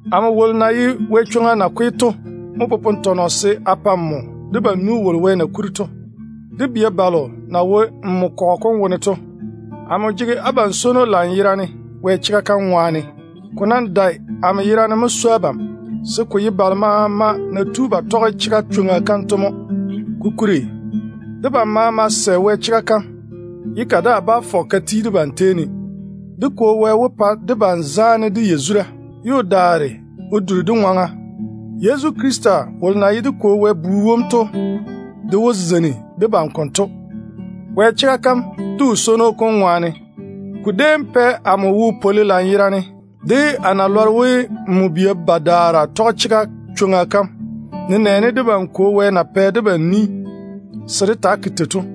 Amo wolo na ye Yezu kɔgɔ kom nakwe to mo popone tɔnɔ se a pa debam nu wolo Wɛ na kuri to, de bia balo na wo nmo kɔgɔ kom wone to. Chega ŋwaane to, amo jege abam swono lanyerane. Ko nam dae amo yerane mo swoi abam, se ko ye de balo maama na tu ba lɔre Wɛ chega kam to mo. Kokuri debam maama sɛ Wɛ chega kam, ye ka daa bá fɔge ka ti debam tei ne. Dé Kwo Wɛ wó pa debam zaane de yazura, ye o daare o duri dé ŋwaŋa. Yezu Krista wolo na ye dé Kwo Wɛ Bu wom to de wó zeini debam konto, Wɛ chega kam de o swono kom ŋwaane. Ko déem pɛ amo wo pwoli lanyerane de a na lɔre we nmo bia bam badaara tɔge chega chwoŋa kam, nenɛɛne debam Kwo Wɛ na pɛ debam ni se dé taa ke tei to.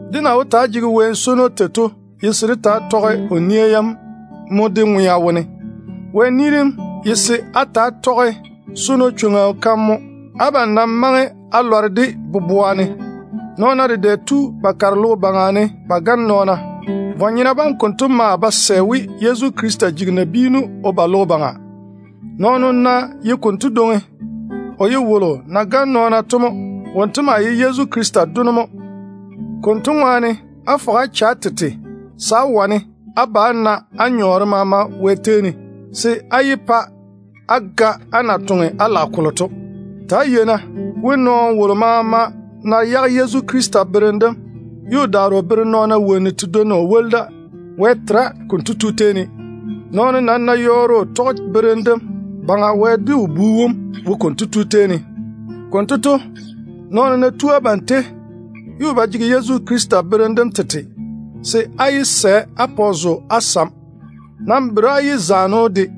Dé na wó taa swoi daane tei to ye se dé taa tɔge o nia yam mo dé ŋwea wone. Wɛ ni dem nam ye se á ta‑á tɔge swono chwoŋa mo. Abam nam maŋe á lɔre o ni dem konto boboa ne mo. Nɔɔna dedɛ tu ba kare logo baŋa ne ba gane nɔɔna. Vwa-nyena bam konto maa ba sɛ we Yezu Krista jigi nabiinu o ba logo baŋa. Nɔɔno ná ye konto dwoŋi, o ye wolo na gane nɔɔna to mo. Wonto maa ye Yezu Krista Dono mo. Konto ŋwaane, á fɔge á che á tete se á wane á na á nyɔɔre maama Wɛ tei ne, se á yé pa á ga á na toŋe á lage kolo to. Ta‑á yei-na we, nɔɔno wolo maama ná yage Yezu Krista berem dem, ye o daare o bere wonnu tedwonna o woli da, Wɛ tera konto tu tei ne. Nɔɔno wolo nam ná yɔɔre o tɔge Yezu berem dem, Baŋa Wɛ de o Bu wom wo konto tu tei ne. Konto to, nɔɔno ná tu abam tei, ye o ba jege Yezu berem dem tete, se á yé sɛ á pa o zo á sam. Nam bere á yé zaane‑o de.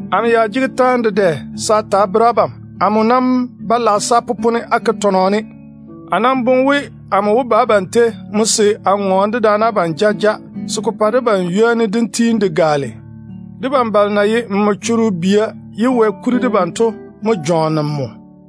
Amo ya jege taane dedɛ se a ta a bere abam. Amo nam ba lage se a popone a ke tɔnɔ ne. A nam boŋe we, a wó ba abam tei mo se a ŋɔɔne dedaane abam jaja, se ko pa debam wopwolo kom tiini ko gaale. Debam balo na ye nmo choro bia ye Wɛ kuri debam to mo jɔɔne nmo.